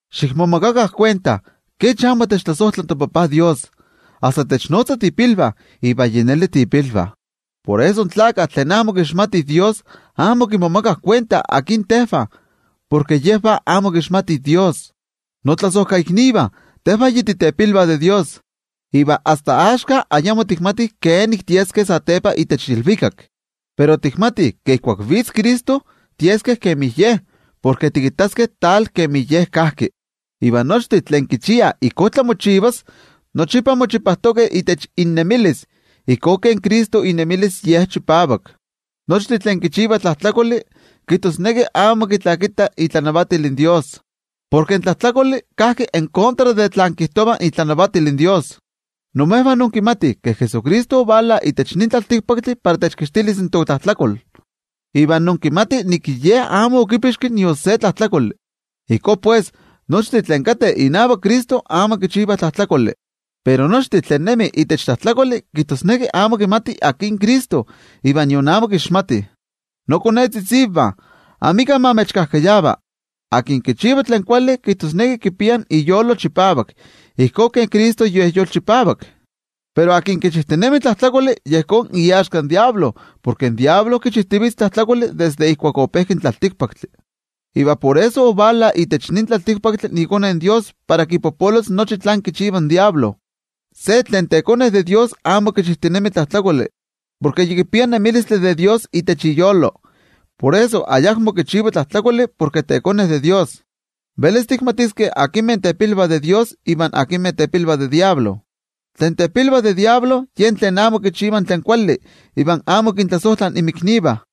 Xikmomakakah kuenta kech amo techtlasojtla toTajtzin Dios, asta technotza tiipilvah, iva yi neli tiipilvah. Por eso in tlakah tlen amo kixmatih Dios, amo kimomakah kuenta akin tejvah, porke yejvah amo kixmatih Dios. Notlasojkaiknivah, tejvah yi titepilvah de Dios. Iva asta axka ayamo tikmatih kenik tieskeh satepa itech ilvikak. Pero tikmatih ke ijkuak vitz in Cristo, tieskeh kemi Ye, porke tikittaskeh ijkó kemi Ye kajki. Iva nochtin tlen kichiah ijkó tlamochivalos, nochipa mochipajtokeh itech innemilis, ijkó kemi Cristo inemilis Ye chipavak. Nochtin tlen kichivah tlajtlakoli kijtosneki amo kitlakitah itlanavatil in toYejwatzi. Porke in tlajtlakoli kajki en kontra de tlen kijtova itlanavatil in toYejwatzi. Imejvah inkimatih ke Jesucristo ovala itech nin tlaltikpaktli para techkixtilis in totlajtlakol, iva inkimatih ke Ye amo okipixki nion se tlajtlakoli. Ijkó pues, nochtin tlen kateh inavak Cristo amo kichivah tlajtlakoli. Pero nochtin tlen nemih itech tlajtlakoli, kijtosneki amo kimatih akin Cristo iva nion amo kixmatih. Nokonetzitzivah, amika ma imechkajkayava. Tlen kichiva tlen kuali, kijtosneki kipia iyolo chipavak ijkó kemi Cristo Ye yolchipavak. Pero tlen kichijtinemi tlajtlakoli, yejón iaxka in Amo Kuali Tlakatl, porke in Amo Kuali Tlakatl kichijtivitz tlajtlakoli desde ijkuak opejki in tlaltikpaktli. Iva por eso ovala itech nin tlaltikpaktli iKone in Dios para kipopolos nochi tlen kichiva in Amo Kuali Tlakatl. Se tlen tekone de Dios amo kichijtinemi tlajtlakoli, porke yi kipia nemilistli de Dios itech iyolo. Por eso ayakmo kichiva tlajtlakoli, porke tekone de Dios. Velis tikmatiskeh akinmeh tepilvah de Dios iva akinmeh tepilvah de yen Amo Kuali Tlakatl: tlen tepilvah de yen Amo Kuali Tlakatl yejvah tlen amo kichivah tlen kuali iva amo kintlasojtlah inmiknivah.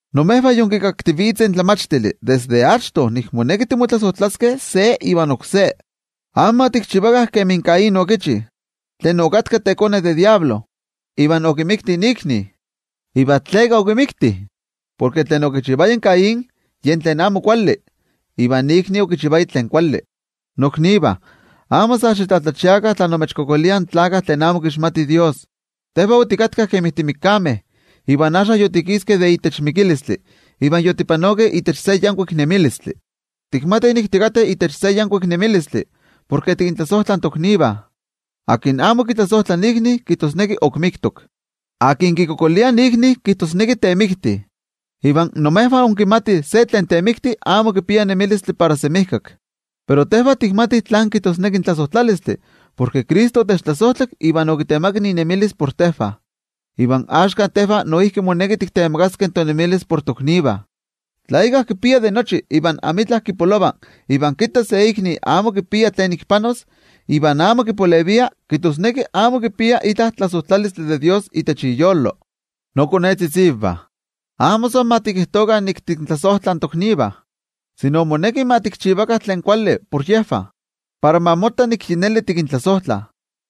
Imejvah yinkikaktivitzeh in tlamachtili desde achto nik moneki timotlasojtlaskeh se ivan oksé. Amo ma tikchivakah kemi Caín okichi, tlen okatka tekone de in Amo Kuali Tlakatl iva okimikti ikni. ¿Iva tleka okimikti? Porke Caín okichivaya tlen amo kuali, iva ikni okichivaya tlen kuali. Noknivah, amo sa xitlatlachiakah tla imechkualankaitah in tlakah tlen amo kixmatih Dios. Tejvah otikatkah kemi timikameh, iva axka yotikiskeh de itech mikilistli iva yotipanokeh itech se yankuik nemilistli. Tikmatih nik tikateh itech se yankuik nemilistli porke tikintlasojtlah in toknivah. Tlen amo kitlasojtla ikni, kijtosneki ok miktok. Tlen kikualankaita ikni kijtosneki temikti, iva imejvah inkimatih ke se tlen temikti amo kipia nemilistli para semijkak. Pero tejvah tikmatih tlán kijtosneki in tlasojtlalistli, porke Cristo otechtlasojtlak iva okitemakak inemilis por tejvah. Iva axka tejvah noijki moneki tiktemakaskeh tonemilis por toknivah. Tla íkka kipia de nochi iva amitla kipolova, iva kitta se ikni amo kipia tlen ik panos, iva amo kipalevia, kijtosneki amo kipia itla tlasojtlalistli de Dios itech iyolo. Nokonetzitzivah, amo san ma tikijtokah nik tikintlasojtlah in toknivah, sino moneki ma tikchivakah tlen kuali por yejvah para ma motta nik yi neli tikintlasojtlah.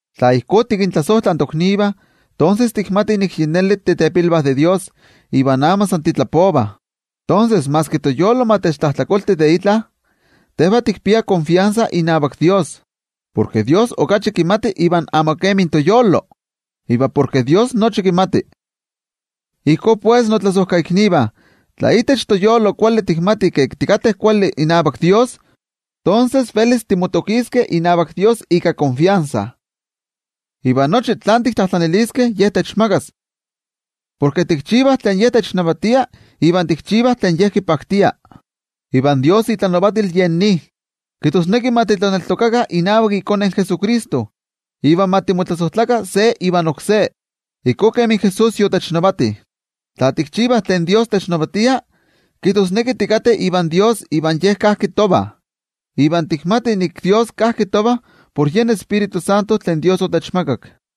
Tla ijkó tikintlasojtlah toknivah, tonses tikmatih nik yi neli titepilvah de Dios iva amo san titlapovah. Tonses, maski toyolo ma techtlajtlakolti de itla, tejvah tikpiah netenmachilistli inavak toYejwatzi. Porke toYejwatzi okachi kimati iva amo kemi toyolo, iva porke toYejwatzi nochi kimati. Ijkó pues, notlasojkaiknivah, tla toyolo amo techtlajtlakoltia de itla, tonses velis timotokiskeh inavak toYejwatzi ika netenmachilistli. Iva nochi tlen tiktlajtlaniliskeh Ye techmakas, porke tikchivah tlen Ye technavatia iva tikchivah tlen Ye kipaktia. Iva itlanavatil yen nin: kijtosneki ma titlaneltokakah inavak iKone Jesucristo, iva ma timotlasojtlakah se ivan oksé, ijkó kemi Jesús yotechnavati. Tla tikchivah tlen technavatia, kijtosneki tikateh ivan toYejwatzi iva Ye kajki tovah. Iva tikmatih ke toYejwatzi kajki tovah, por yen Tioijyotzintli tlen Ye otechmakak.